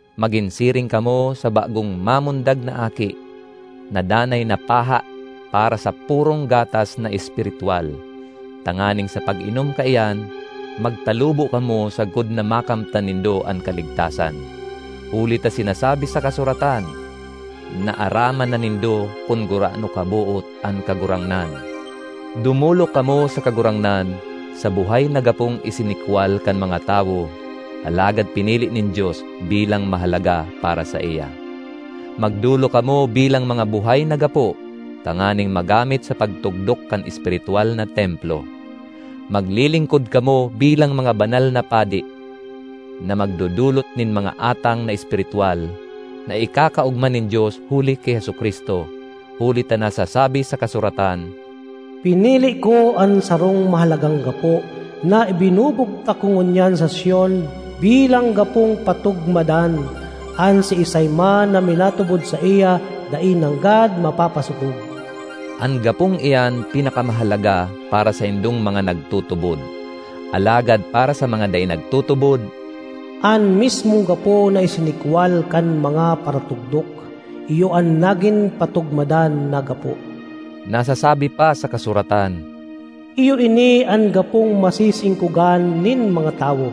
Magin siring kamo sa bagong mamundag na aki, na danay na paha para sa purong gatas na espiritwal, tanganing sa pag-inom kaiyan, magtalubo kamo sagkod na makamtan nindo an kaligtasan. Huli ta sinasabi sa kasuratan, “Naaraman na nindo kun gurano kaboot an Kagurangnan.” Dumolok kamo sa Kagurangnan, sa buhay na gapong isinikwal kan mga tawo, alagad pinili nin Dios bilang mahalaga para saiya. Magdolok kamo bilang mga buhay na gapo tanganing magamit sa pagtugdok kan espiritwal na templo; maglilingkod kamo bilang mga banal na padi, na magdodolot nin mga atang na espiritwal, na ikakaogma nin Dios huli ki Jesu-Cristo. Huli ta nasasabi sa kasuratan, “Pinili ko an sarong mahalagang gapo na ibinubugtak ko ngunyan sa Sion bilang gapong patugmadan; an siisay man na minatubod saiya dai nanggad mapapasopog.” An gapong iyan pinakamahalaga para saindong mga nagtutubod; alagad para sa mga dai nagtutubod, “An mismong gapo na isinikwal kan mga paratugdok, iyo an nagin patugmadan na gapo.” Nasasabi pa sa kasuratan, “Iyo ini an gapong masisingkogan nin mga tawo,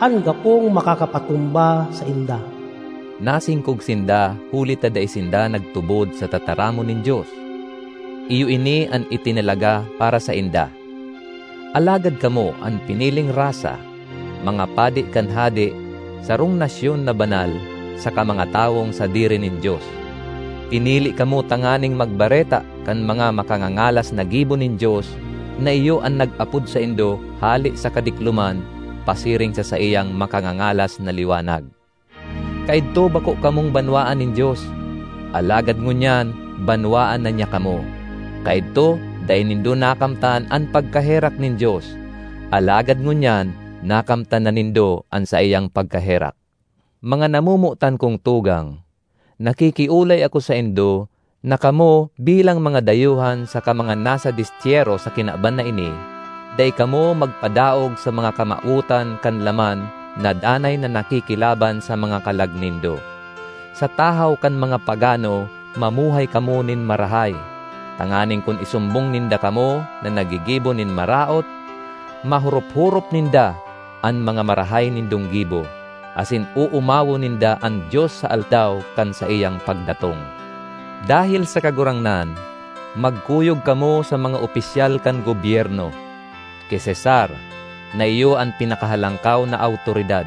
an gapong makakapatumba sainda.” Nasingkog sinda huli ta dai sinda nagtubod sa tataramon nin Dios; iyo ini an itinalaga para sainda. Alagad kamo an piniling rasa, mga padi kan Hade, sarong nasyon na banal, saka mga tawong sadiri nin Dios. Pinili kamo tanganing magbareta kan mga makangangalas na gibo nin Dios na iyo an nag-apod saindo hale sa kadikloman pasiring sa saiyang makangangalas na liwanag. Kaidto bako kamong banwaan nin Dios, alagad ngunyan banwaan na niya kamo. Kaidto dai nindo nakamtan an pagkaherak nin Dios, alagad ngunyan nakamtan na nindo an saiyang pagkaherak. Mga namomotan kong tugang, nakikiolay ako saindo na kamo, bilang mga dayuhan saka mga nasa destyero sa kinaban na ini, dai kamo magpadaog sa mga kamawotan kan laman na danay na nakikilaban sa mga kalag nindo. Sa tahaw kan mga pagano mamuhay kamo nin marahay, tanganing kun isumbong ninda kamo na naggigibo nin maraot, mahorop-horop ninda an mga marahay nindong gibo, asin oomawon ninda an Dios sa Aldaw kan saiyang pagdatong. Dahel sa Kagurangnan, magkuyog kamo sa mga opisyal kan gobyerno: ki Cesar, na iyo an pinakahalangkaw na awtoridad,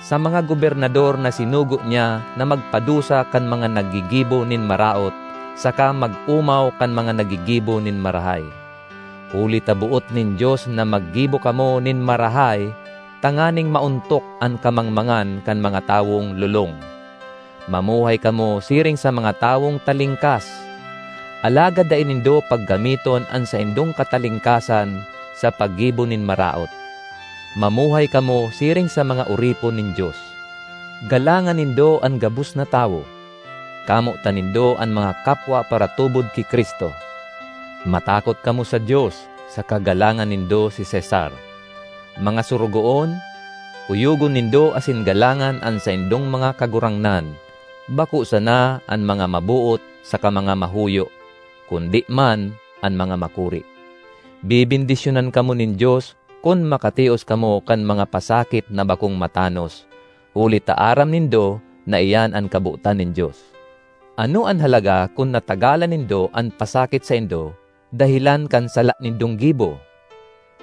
sa mga gobernador na sinugo niya na magpadusa kan mga naggigibo nin maraot saka mag-omaw kan mga naggigibo nin marahay. Huli ta boot nin Dios na maggibo kamo nin marahay tanganing maontok an kamangmangan kan mga tawong lolong. Mamuhay kamo siring sa mga tawong talingkas; alagad dai nindo paggamiton an saindong katalingkasan sa paggibo nin maraot. Mamuhay kamo siring sa mga oripon nin Dios. Galangan nindo an gabos na tawo; kamotan nindo an mga kapwa paratubod ki Cristo. Matakot kamo sa Dios, saka galangan nindo si Cesar. Mga sorogoon, kuyogon nindo asin galangan an saindong mga kagurangnan, bako sana an mga maboot saka mga mahuyo, kundi man an mga makuri. Bebendisyonan kamo nin Dios kun makatios kamo kan mga pasakit na bakong matanos, huli ta aram nindo na iyan an kabotan nin Dios. Ano an halaga kun natagalan nindo an pasakit saindo dahelan kan sala nindong gibo?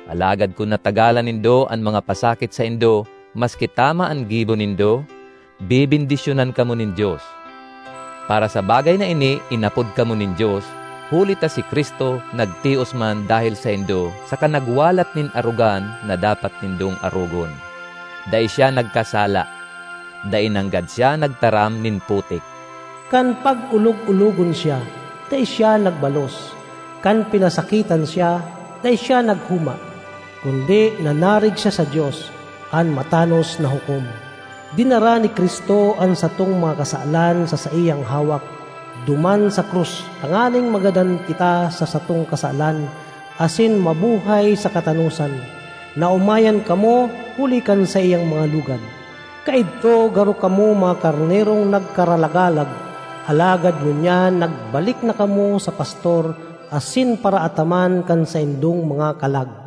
Alagad kun natagalan nindo an mga pasakit saindo maski tama an gibo nindo, bebendisyonan kamo nin Dios. Para sa bagay na ini inapod kamo nin Dios, huli ta si Cristo nagtios man dahel saindo saka nagwalat nin arogan na dapat nindong arogon. Dai siya nagkasala; dai nanggad siya nagtaram nin putik. Kan pag-olog-ologon siya, dai siya nagbalos; kan pinasakitan siya, dai siya naghoma, kundi nanarig siya sa Dios, an matanos na Hukom. Dinara ni Cristo an satong mga kasalan sa saiyang hawak duman sa krus tanganing magadan kita sa satong kasalan asin mabuhay sa katanosan. Naomayan kamo huli kan saiyang mga lugad. Kaidto garo kamo mga karnerong nagkaralagalag, alagad ngunyan nagbalik na kamo sa Pastor asin Paraataman kan saindong mga kalag.